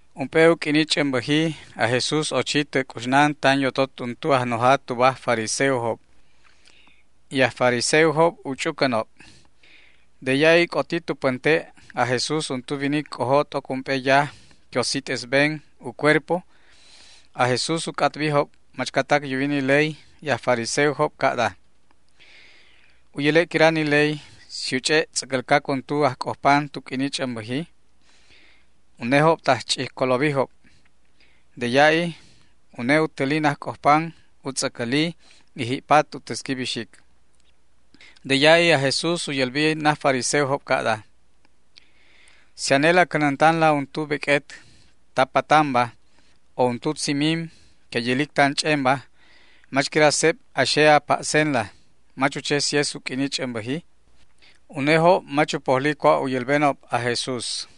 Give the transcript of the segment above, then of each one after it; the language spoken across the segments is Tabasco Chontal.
Ump'e u q'uini ch'ämbäji aj Jesús ochi tä c'uxnan tan yotot untu ajnoja tuba aj fariseojob, y ni aj fariseojobba u ch'ucänob. De ya'i c'oti tu pänte' aj Jesús untu winic c'ojo t'oc ump'e yaj que u sit'esben u cuerpoba. Aj Jesús u c'atbijob machcatac yuwi ni ley y aj fariseojob ca'da: ―¿U yäle' quira ni ley si u ch'e' tz'äcälcac untu ajc'ojpan tu q'uini ch'ämbäji? Unejob tajch'ijcolobijob. De ya'i une u täli najc'ojpan u tz'äcälin y ji'pat u täsqui bixic. De ya'i aj Jesús u yälbi naj fariseojob ca'da: ―Si anela a cänäntanla untu beq'uet ta patanba o untu tzimim que yälic tan ch'enba, ¿mach quira seb a xe a pa'senla, mach u che si es u q'uini ch'ämbäji? Unejob mach u pojli cua' u yälbenob aj Jesús.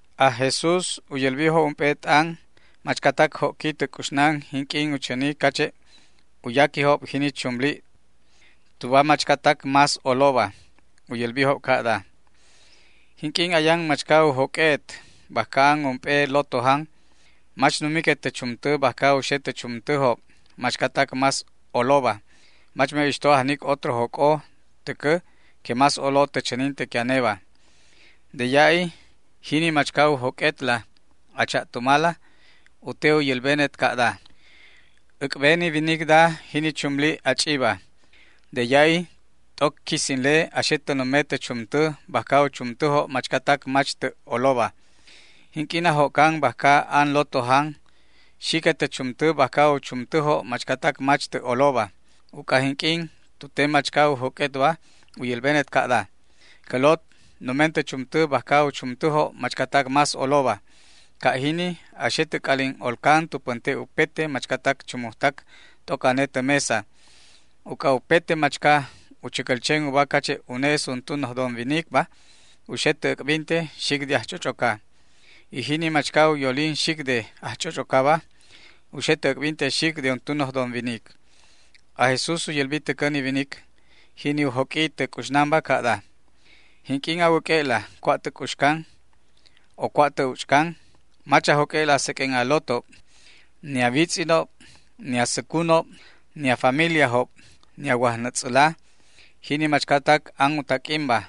Aj Jesús u yälbijob ump'e t'an machcatac jo'qui tä c'uxnan jinq'uin u chäni cache' u yaquijob jini chumlib tuba machcatac más oloba. U yälbijob ca'da: ―Jinq'uin ayan machca u joq'ue'et bajca an ump'e lotojan, mach numiquet tä chumtä bajca u xe tä chumtäjob machcatac más oloba, mach me'ixto ajnic otro joc'o täcä que más olo tä chäninte que aneba. De ya'i jini machca u joq'uetla a cha'tumala u te u yälbenet ca'da: “Äc'ben ni winicda jini chumlib a ch'iba”. De ya'i t'oc quisinle a xe tä nume tä chumtä bajca u chumtäjob machcatac mach tä' oloba. Jinq'uin a jo'can bajca an lotojanba, xiquet tä chumtä bajca u chumtäjob machcatac mach tä' oloba, uc'a jinq'uin tu te machca u joq'uetba u yälbenet ca'da: “Cä lot, numen tä chumtä bajca u chumtäjob machcatac más oloba”. Ca' jini a xe tä c'alin olcan tu pänte' upete machcatac chumujtac t'oc ane tä mesa. Uc'a upete machca u chäcäl chen uba cache' une es untu noj don winicba, u xe tä äc'binte xic de ajch'och'oca, y jini machca u yolin xic de ajch'och'ocaba u xe tä äc'binte xic de untu noj don winic. Aj Jesús u yälbi täcä ni winic, jini u joq'ui tä c'uxnanba, ca'da: ―Jinq'uin a wäq'ue'la cua' tä c'uxcan o cua' tä uch'can, mach a joq'ue'la seq'uen a lotob, ni a witz'inob, ni a säcunob, ni a familiajob, ni a wajnätz'äla, jini machcatac an u taq'uinba,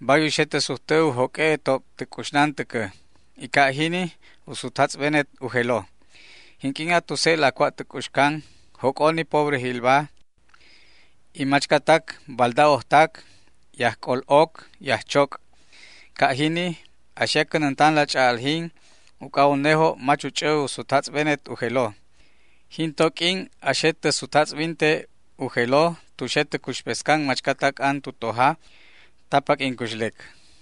bay u xe tä sujtä u joq'ue'etob tä c'uxnan täcä, y ca' jini u sutjatz'benet u jelo. Jinq'uin a tuse'la cua' tä c'uxcan joc'o ni pobrejilba, y machcatac balda'ojtac, y ajc'ol'oc y ajchoc'. Ca' jini a xe a cänäntan ch'a'aljin, uc'a unejob mach u ch'ä u sutjatz'benet u jelo. Jin to q'uin a xe tä sutjatz'binte u jelo tu xe tä cuxpescan machcatac ni an tu tojaba ta paq'uin cuxlec.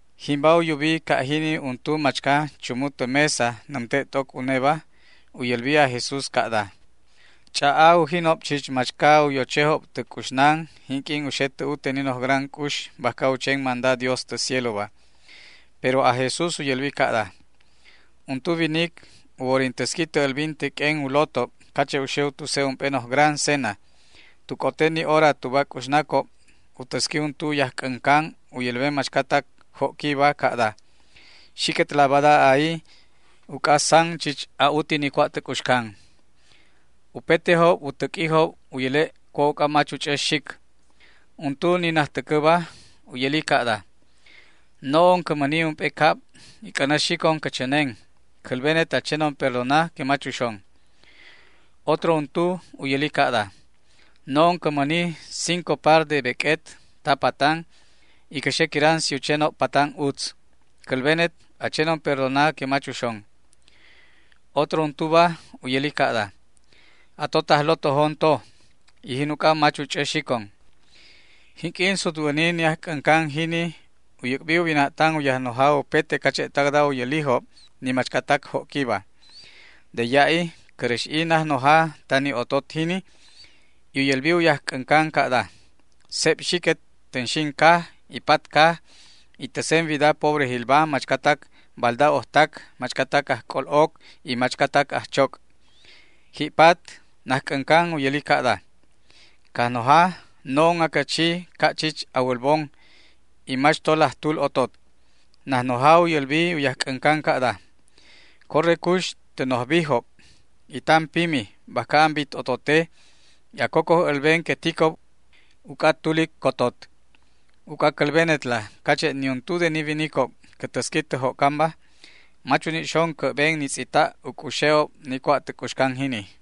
Jimba u yubi ca' jini untu machca chumu tä mesa nämte' t'oc uneba, y u yälbi aj Jesús ca'da: ―Ch'a'a ujinob chich machca u yochejob tä c'uxnan jinq'uin u xe tä ute ni noj gran c'ux bajca u chen manda Dios tä cieloba. Pero aj Jesús u yälbi ca'da: ―Untu winic u worin täsqui tä älbinte q'uen u lotob cache' u xe u tuse' ump'e noj gran c'ux. Tu c'ote ni hora tuba c'uxnacob u täsqui untu u yajc'äncan u yälben machcatac jo'quiba ca'da: “Xiquetla bada, a'i, uc'a san chich a'uti ni cua' tä c'uxcan”. Upetejob u täq'uijob u yäle' cua' uc'a mach u ch'ä xic. Untu, ni najtäcäba u yäli ca'da: “No'on cä mäni ump'e cab y c'änä xicon cä chänen; cälbenet a chenon perdona que mach uxon”. Otro untu u yäli ca'da: “No'on cä mäni cinco par de beq'uet ta patanba, y cä xe quiran si u chenob patan utz; cälbenet a chenon perdona que mach uxon”. Otro untuba u yäli ca'da: “Atotaj lotojon to, y jin uc'a mach u ch'ä xicon”. Jinq'uin sutwäni ni ajc'äncan jini u yäc'bi u wina'tan u yajnoja upete cache'tacda u yälijob ni machcatac jo'quiba. De ya'i cäräx'i najnoja ta ni otot jini y u yälbi u yajc'äncan ca'da: “Seb xiquet tänxin caj y papat caj y täsen wida pobrejilba, machcatac balda'ojtac, machcatac ajc'ol'oc y machcatac ajchoc'”. Ji'pat najc'äncan u yäli ca'da: “Cajnoja, no'on acä chi ca' chich a wälbon y mach to laj tul otot”. Najnoja u yälbi u yajc'äncan ca'da: “Corre cux tä noj bijob y tan pimi bajca an bit otote y a cocoj älben que ticob uc'a tulic cotot. Uc'a cälbenetla cache' niuntu de ni winicob cä täsqui tä jo'canba mach uni' xon cä'ben ni tz'ita' u c'uxe'ob ni cua' tä c'uxcan jini”.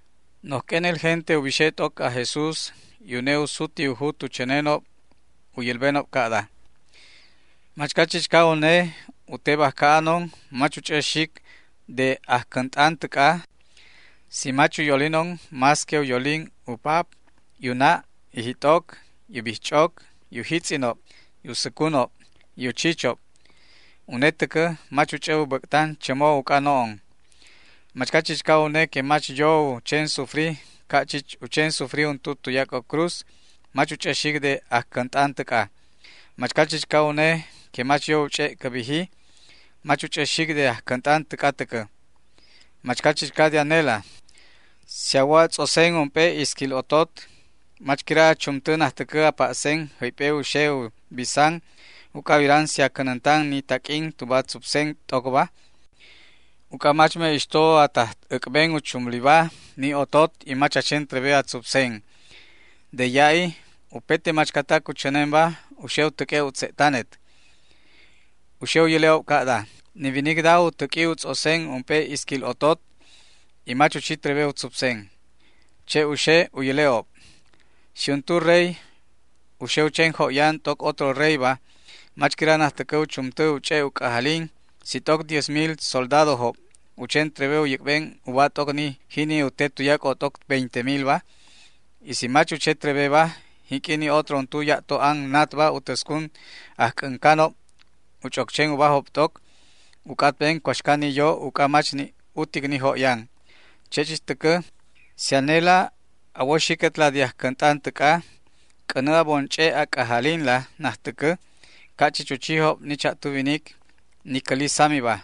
Noj q'uenel gente u bixe t'oc aj Jesús y une u suti u jut u chänenob u yälbenob ca'da: ―Machca chichca une u te bajca anon mach u ch'ä xic de ajcänt'an täc'a si mach u yolinon más que u yolin u pap y u na' y jit'oc y u bijch'oc y u jitz'inob y u säcunob y u chichob. Une täcä mach u ch'ä u bäc'tan chämo uc'a no'on. Machca chichca une que mach yo u chen sufri ca' chich u chen sufri untu tuyac'o cruz mach u ch'ä xic de ajcänt'an täc'a. Machca chichca une que mach yo u ch'e' cä biji mach u ch'ä xic de ajcänt'an täc'a täcä. Machca chichca de anela, si a wo a tz'osen ump'e isquil otot, ¿mach quira a chumtä najtäcä a pa'sen jäyp'e u xe u bisan uc'a a wiran si a cänäntan ni taq'uin tuba a tzupsen t'ocba? Uc'a mach me'ixto a taj äc'ben u chumliba ni otot y mach a chen trebe a tzupsen. De ya'i upete machcatac u chänenba u xe u täq'ue' u tze'tanet. U xe u yäle'ob ca'daba: “Ni winicda u täq'ui u tz'osen ump'e isquil otot y mach u chi trebe u tzupsen”. Che' u xe u yäle'ob. Si untu rey u xe u chen jo'yan t'oc otro reyba, ¿mach quira najtäcä u chumtä u ch'e' u c'ajalin si t'oc diez mil soldadojob u chen trebe u yäc'ben uba t'oc ni jini u te tuyac'o t'oc veinte milba? Y si mach u che trebeba, jinq'uin ni otro untu ya'to an natba u täscun ajc'äncanob u ch'oc chen ubajob t'oc u c'atben cuaxca ni yo uc'a mach ni' utic ni jo'yan. Che' chich täcä, si anela a wo xiquetla de ajcänt'an täc'a, c'änä a bon ch'e' a c'ajalinla najtäcä ca' chich u chijob ni cha'tu winic, ni cäli samiba,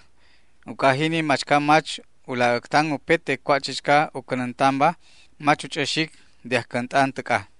uc'a jini machca mach u laj äctan upete cua' chichca u cänäntanba mach u ch'ä xic de ajcänt'an täc'a.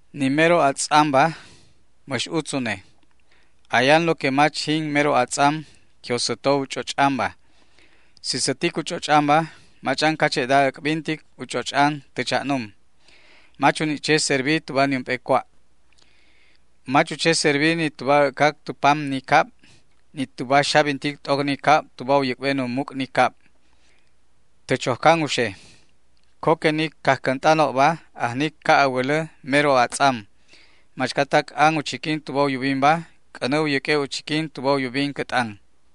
’Ni mero atz'amba mäx utz une. Ayan lo que mach jin mero atz'am que u säto u ch'och'anba. Si sätic u ch'och'anba mach'an cache'da äc'bintic u ch'och'an tä cha'num. Mach u ni' che servi tuba niump'e cua'. Mach u che servi ni tuba ä'cac tu pam ni cab, ni tuba xabintic t'oc ni cab tuba u yäc'ben u muc' ni cab. Tä chojcan u xe. Co que ni cajcänt'anobba ajnicob ca' a wälä mero atz'am. Machcatac an u chiquin tuba u yubinba, c'änä u yäq'ue' u chiquin tuba u yubin cä t'an.